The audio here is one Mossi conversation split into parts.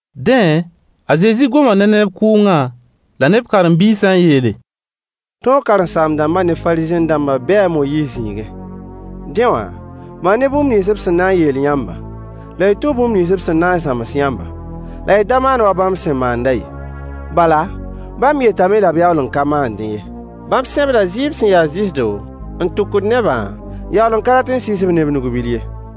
Dẽ, a Zezi goma ne neb kʋʋngã la ne b karen-biisã n yeele: Tõog karen-saam-dãmbã ne Fariisẽ-dãmbã bee a Moyiis zĩigẽ. Dẽ wã, maan-y bũmb nins b sẽn na n yeel yãmbã, la y tũ bũmb nins b sẽn na n zãms yãmbã, la y da maan wa bãmb sẽn maandã ye. Bala, bãmb yetame la b yaool n ka maandẽ ye. Bãmb sẽbda zɩɩb sẽn ya zɩsdo n tʋgend nebã, n yaool n ka rat n sɩɩs-b ne b nug-bil ye.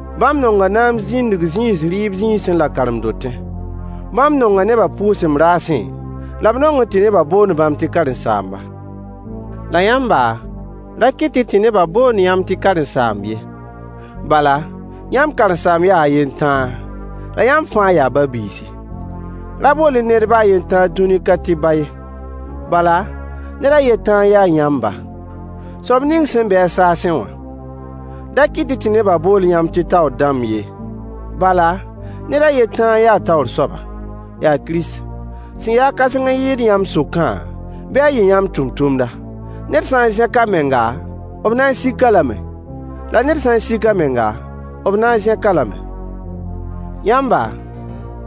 Bãmb nonga naam zĩndg zĩis rɩɩb zĩisẽ la karen-dotẽ. Bãmb nonga nebã pʋʋsem raasẽ, la b nongẽ tɩ nebã boond bãmb tɩ karen-saamba. La yãmba, ra kɩt-y tɩ nebã boond yãmb tɩ karen-saamb ye. Bala, yãmb karen-saamb yaa a yen tãa, la yãmb fãa yaa ba-biisi. Da bool-y ned baa a yen tãa dũni ka tɩ ba ye. Bala, ned a yen tãa n ya yãmb ba, soab ning sẽn be-a saasẽ wã. Da kɩt-y tɩ nebã bool yãmb tɩ taoor dãmb ye, bala, ned a yen tãa n ya taoor soaba, yaa Kirist. Sẽn ya-a kãseng n yɩɩd yãmb sʋkã, bɩ a yɩ yãmb tʋmtʋmda. Ned sã n zẽk a menga, b na n sik-a lame, la ned sã n sik a menga, b na n zẽk-a lame. Yãmba,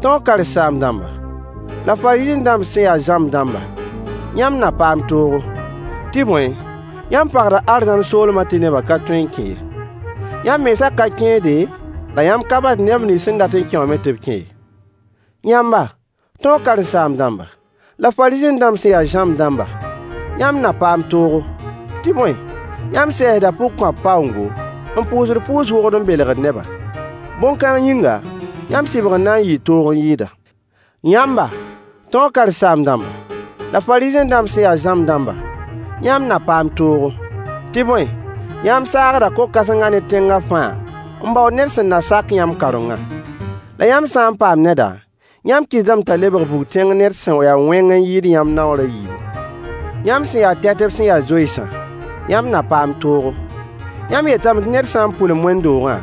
tõog karen-saam-dãmbã, la Fariisẽ-dãmb sẽn ya zãmb dãmbã, yãmb na paam toogo! Tɩ bõe, yãmb pagda arzãn soolmã tɩ nebã ka tõe n kẽ ye. Yãmb mensã ka kẽede, la yãmb ka basd neb nins sẽn dat n kẽ wã me tɩ b kẽ ye. [ Yãmba, tõog karen-saam-dãmbã, la Fariisẽ-dãmb sẽn ya zãmb dãmba, yãmb na paam toogo! Tɩ bõe, yãmb sɛɛsda pʋgkõap paoongo, n pʋʋsd pʋʋs-wogd n belgd neba. Bõn-kãng yĩnga, yãmb sɩbgr na n yɩɩ toog n yɩɩda.] Yãmba, tõog karen-saam-dãmba, la Fariisẽ-dãmb sẽn ya zãmb dãmba, yãmb na paam toogo! Tɩ bõe, yãmb saagda ko-kãsengã ne tẽngã fãa n baood ned sẽn na sak yãmb kaorengã. La yãmb sã n paam neda, yãmb kɩtdame t'a lebg bug-tẽng ned sẽn ya wẽng n yɩɩd yãmb naoor a yiibu. Yãmb sẽn ya tɛtb sẽn ya zoensã, yãmb na paam toogo! Yãmb yetame tɩ ned sã n pʋlem wẽnd-doogã,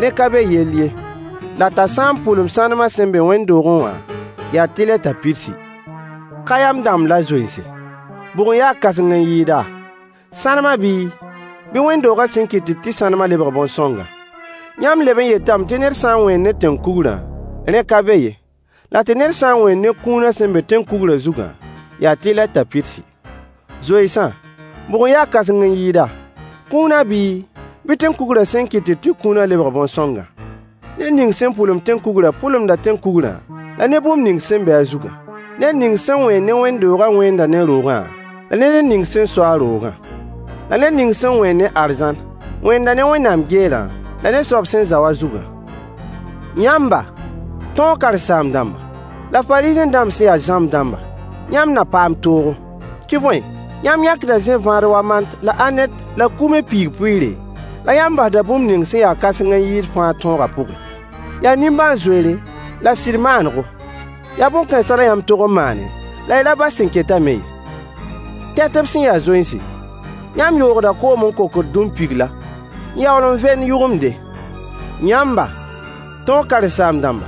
rẽ ka be yell ye, la t'a sã n pʋlem sãnemã sẽn be wẽnd-doogẽ wã, yaa tɩlɛ t'a pidsi. Ka-yam dãmb la zoense, bʋg n ya kãseng n yɩɩda, sãnemã bii, bɩ wẽnd-doogã sẽn kɩtd tɩ sãnemã lebg bõn-sõngã? Yãmb leb n yetame tɩ ned sã n wẽen ne tẽn-kugrã, rẽ ka be ye, la tɩ ned sã n wẽen ne kũunã sẽn be tẽn-kugrã zugã, yaa tɩlɛ t'a pidsi. Zoensã, bʋg n ya kãseng n yɩɩda, kũunã bii, bɩ tẽn-kugrã sẽn kɩtd tɩ kũunã lebg bõn-sõngã? Ned ning sẽn pʋlemd tẽn-kugrã pʋlemda tẽn-kugrã la ne bũmb ning sẽn be a zugã. Ned ning sẽn wẽend ne wẽnd-doogã wẽenda ne roogã la ne ned ning sẽn so-a roogã. La ned ning sẽn wẽend ne arzãn wẽenda ne Wẽnnaam geerã la ne a soab sẽn zao a zugã. Yãmba, tõog karen-saam-dãmba, la Fariisẽ-dãmb sẽn ya zãmb dãmbã, yãmb na paam toogo! Tɩ bõe, yãmb yãkda zẽ-vãad wa mant Mant, Anet, Kume Yaa zẽ-vãad buudu. la anet la kume piig-pʋɩɩre, la yãmb basda bũmb ning sẽn ya kãseng n yɩɩd fãa tõogã pʋgẽ: yaa nimbãan-zoeere la sɩd maanego. Yaa bõn-kãensã la yãmb tog n maane, la y da bas sẽn ketã me ye. Tɛtb sẽn ya zoense, yãmb yoogda koom n kokd dũmpigla, n yaool n vend yʋgemde. Yãmba, tõog karen-saam-dãmba,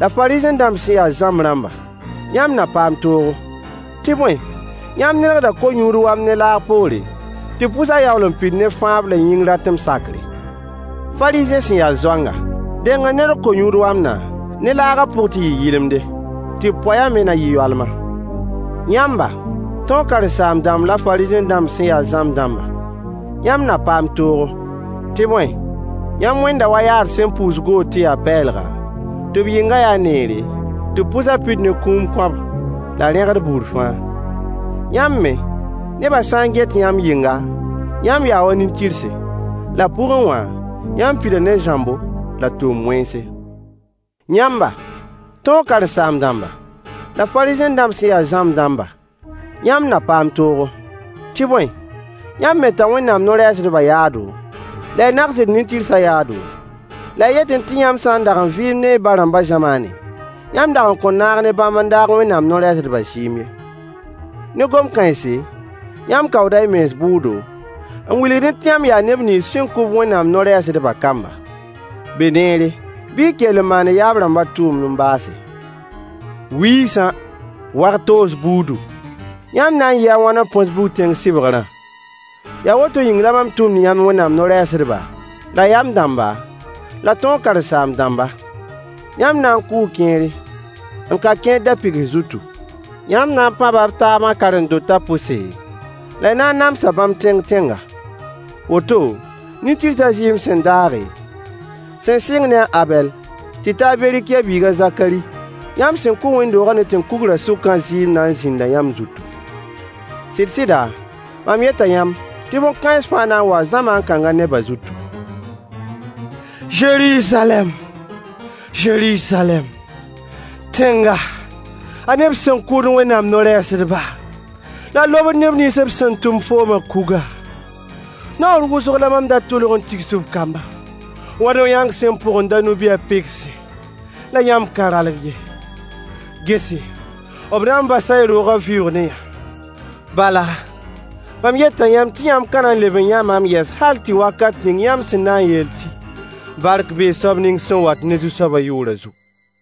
la Fariisẽ-dãmb sẽn ya zãmb rãmbã, yãmb na paam toogo! Tɩ bõe, yãmb nedgda ko-yũud wamd ne laag poore, tɩ b pʋsã yaool n pid ne fãab la yĩng ratem sakre. Fariisẽ sẽn ya zoanga, deng n nedg ko-yũud wamdã ne laagã pʋg tɩ yɩ yɩlemde, tɩ b poeyã me na yɩ yoalma. Yãmba, tõog karen-saam-dãmba la Fariisẽ-dãmb sẽn ya zãmb rãmbã, yãmb na paam toogo! Tɩ bõe, yãmb wẽnda wa yaad sẽn puus goor tɩ ya pɛɛlga, tɩ b yɩngã ya neere, tɩ b pʋsa pid ne kũum kõab, la rẽgd buud fãa. Yãmb me, nebã sã n get yãmb yɩngã, yãmb yaa wa nin-tɩrse. La pʋgẽ wã, yãmb pida ne zãmbo la tʋʋm-wẽnse. Yãmba, tõog karen-saam-dãmba, la Fariisẽ-dãmb sẽn ya zãmb dãmba, yãmb na paam toogo! Tɩ bõe, yãmb meta Wẽnnaam no-rɛɛsdbã yaado, la y nagsd nin-tɩrsã yaado, la y yetẽ tɩ yãmb sã n dag n vɩɩmdẽ y ba-rãmbã zamaanẽ, yãmb dag n kõn naag ne bãmb n daag Wẽnnaam no-rɛɛsdbã zɩɩm ye. Ne gom-kãense, yãmb kaooda y mens bʋʋdo, n wilgdẽ tɩ yãmb yaa neb nins sẽn kʋ-b Wẽnnaam no-rɛɛsdbã kamba. Beneere, bɩ y kell n maan y yaab-rãmbã tʋʋmd n baase. Wiisã! Wag-toos buudu! Yãmb na n yɩɩ a wãn n põs bug-tẽng sɩbgrã? Yaa woto yĩng la mam tʋmd yãmb Wẽnnaam no-rɛɛsdba, la yam dãmba, la tõog karen-saam-dãmba. Yãmb na n kʋʋ kẽere, n ka kẽer da-pɩgs zutu. Yãmb na n pãba b taabã karen-dotã pʋse, la y na n namsa bãmb tẽng-tẽnga. Woto, nin-tɩrsã zɩɩm sẽn daage, sẽn sɩng ne a Abɛl tɩ ta a Berikɩya biig a Zakari yãmb sẽn kʋ wẽnd-doogã ne tẽn-kugrã sʋkã zɩɩm na n zĩnda yãmb zutu. Sɩd-sɩda, mam yeta yãmb tɩ bõn-kãens fãa na n waa zamaan kãngã nebã zutu. Zeruzalɛm! Zeruzalɛm! Tẽnga, a neb sẽn kʋʋd Wẽnnaam no-rɛɛsdba, la a lobd neb nins b sẽn tʋm foomã kuga! Naoor wʋsg la mam da tʋlg n tigs f kambã wa no-yãang sẽn põgended a no-bi a pɩgsẽ, la yãmb ka ralg ye. Gese, b na n basa y roogã vɩʋʋg ne-yã. Bala, mam yeta yãmb tɩ yãmb ka na n leb n yã maam yɛs hal tɩ ta wakat ning yãmb sẽn na n yeel tɩ: “Bark bee soab ning sẽn wat ne Zu-soabã yʋʋrã zugu.”